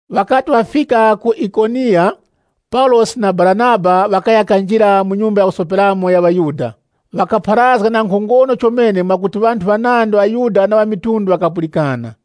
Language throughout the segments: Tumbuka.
Ŵakati ŵafika ku Ikoniya, Paulosi na Baranaba ŵakaya kanjira mu nyumba ya kusoperamo ya ŵaYuda. Ŵakapharazga na nkhongono chomene mwakuti ŵanthu ŵanandi ŵaYuda na ŵamitundu ŵakapulikana.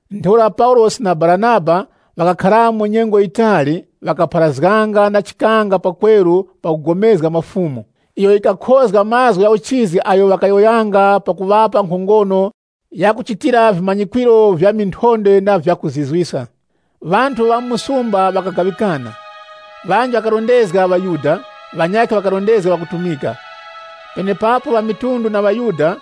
Ntheura Paulosi na Baranaba ŵakakharamo nyengo yitali, ŵakapharazganga na chikanga pakweru pakugomezga mwa Fumu, iyo yikakhozga mazgu gha uchizi agho ŵakayowoyanga pakuŵapa nkhongono ya kuchitira vimanyikwiro vya minthondwe na vya kuzizwiska. Ŵanthu ŵa mu msumba ŵakagaŵikana. Ŵanji ŵakarondezga ŵaYuda, ŵanyakhe ŵakarondezga ŵakutumika. Penepapo ŵamitundu na ŵaYuda,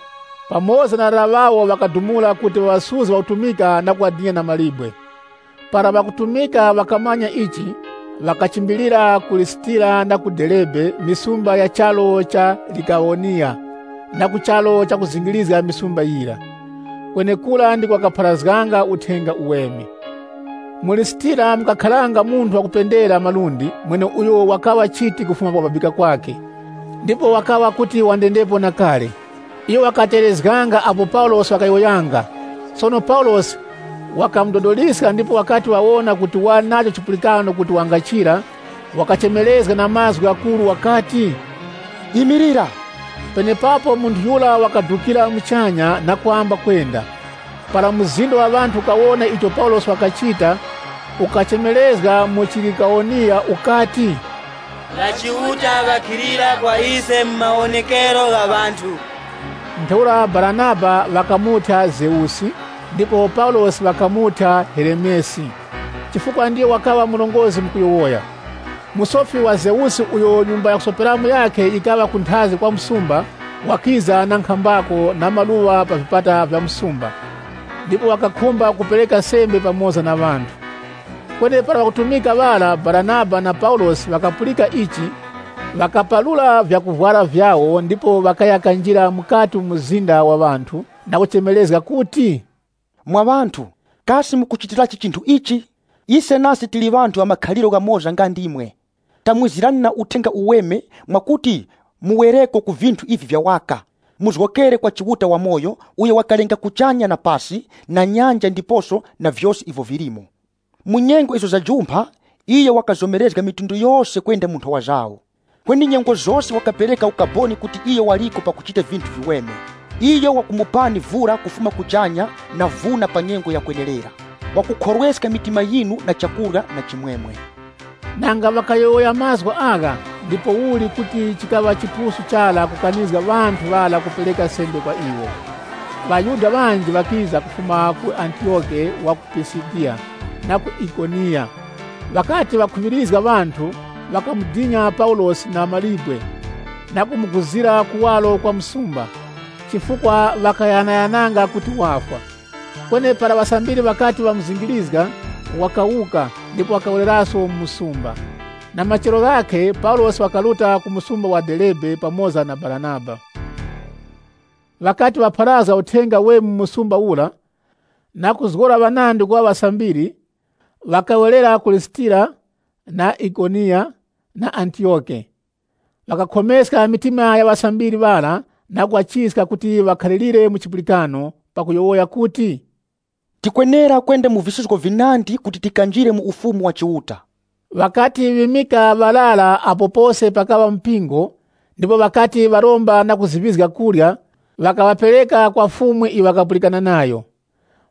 pamoza na ŵarara ŵawo ŵakadumula kuti ŵaŵasuzge ŵakutumika na kuŵadina na mawe. Para ŵakutumika ŵakamanya ichi, ŵakachimbilira ku Lisitira na Derebe misumba ya charu cha Likawoniya, na ku charu cha kuzingirizga misumba yira. Kwenekura ndiko ŵakapharazganga Uthenga Uweme. Mu Lisitira mukakharanga munthu wakupendera malundi, mweneuyo wakaŵa chiti kufuma kukubabika kwakhe, ndipo wakaŵa kuti wandendepo na kale. Iyo wakategherezganga apo Paulosi wakayowoyanga. Sono Paulosi wakamudodoliska ndipo wakati wawona kuti wali nacho chipulikano kuti wangachira, wakachemerezga na mazgu ghakuru wakati, “Imilira!” Penepapo munthu yura wakadukira muchanya na kwamba kwenda. Para mzinda wa ŵanthu ukawona icho Paulosi wakachita, ukachemerezga mu chiLikawoniya ukati, “Ŵachiuta ŵakhilira kwa ise mu mawonekero gha ŵanthu!” Ntheura Baranaba ŵakamuthya Zeusi, ndipo Paulosi ŵakamuthya Heremesi, chifukwa ndiyo wakaŵa murongozgi mu kuyowoya. Musofi wa Zeusi, uyo nyumba ya chiuta wakhe yikaŵa kunthazi kwa msumba, wakiza na nkhambako na maluŵa pa vipata vya msumba, ndipo wakakhumba kupereka sembe pamoza na ŵanthu. Kweni para ŵakutumika ŵara, Baranaba na Paulosi ŵakapulika ichi, ŵakaparura vyakuvwara vyawo ndipo ŵakaya kanjira mukati mu mzinda wa ŵanthu na kuchemerezga kuti. “Mwa ŵanthu, kasi mukuchitirachi chinthu ichi? Ise nase tili ŵanthu ŵa makhaliro ghamoza nga ndimwe. Tamwizirani na Uthenga Uweme, mwakuti muwereko ku vinthu ivi vya waka, muzgokere kwa Chiuta wamoyo, uyo wakalenga kuchanya na pasi, na nyanja ndiposo na vyose ivyo vilimo. Mu miwiro iyo yajumpha, iyo wakazomerezga mafuko ghose kwenda mu nthowa zawo. Kweni nyengo zose wakapereka ukaboni kuti iyo waliko pakuchita vinthu viweme. Iyo wakumupani vura kufuma kuchanya na vuna pa nyengo ya kwenerera. Wakukhorweska mitima yinu na chakurya na chimwemwe.” Nanga ŵakayowoya mazgu agha, ndipouli kuti chikaŵa chipusu chara kukanizga ŵanthu ŵara kupereka sembe kwa iwo. ŴaYuda ŵanji ŵakiza kufuma ku Antiyoke wa ku Pisidiya na ku Ikoniya. Ŵakati ŵakhuŵirizga ŵanthu, ŵakamudina Paulosi na mawe na kumuguzira kuwaro kwa msumba, chifukwa ŵakaghanaghananga kuti wafwa. Kweni para ŵasambiri ŵakati ŵamuzingirizga, wakawuka ndipo wakawereraso mu msumba. Na machero ghakhe Paulosi wakaruta ku msumba wa Derebe pamoza na Baranaba. Ŵakati ŵapharazga Uthenga Uweme mu msumba ura, na kuzgora ŵanandi kuŵa ŵasambiri, ŵakawerera ku Lisitira, na Ikoniya, na Antiyoke. Ŵakakhomeska mitima ya ŵasambiri ŵara na kuŵachiska kuti ŵakhalirire mu chipulikano, pakuyowoya kuti, “Tikwenera kwenda mu visuzgo vinandi kuti tikanjire mu Ufumu wa Chiuta.” Ŵakati ŵimika ŵarara apo pose pakaŵa mpingo, ndipo ŵakati ŵakuromba na kuziŵizga kurya, ŵakaŵapereka kwa Fumu iyo ŵakapulikana nayo.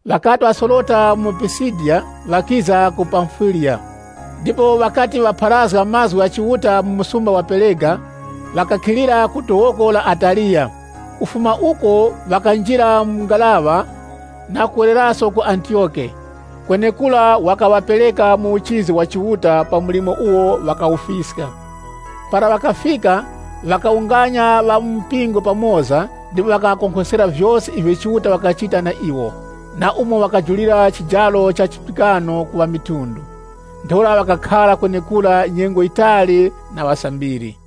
Ŵakati ŵasorota mu Pisidiya, ŵakiza ku Pamfiliya. Ndipo ŵakati ŵapharazga mazgu gha Chiuta mu msumba wa Perega, ŵakakhilira ku dowoko la Ataliya. Kufuma uko ŵakanjira mu ngaraŵa na kuwereraso ku Antiyoke, kwenekura wakaŵapereka mu uchizi wa Chiuta pa mlimo uwo ŵakawufiska. Para ŵakafika, ŵakawunganya ŵa mu mpingo pamoza ndipo wakaŵakonkhoskera vyose ivyo Chiuta wakachita na iwo, na umo wakajulira chijaro cha chipulikano ku ŵamitundu. Ntheura ŵakakhara kwenekura nyengo yitali na ŵasambiri.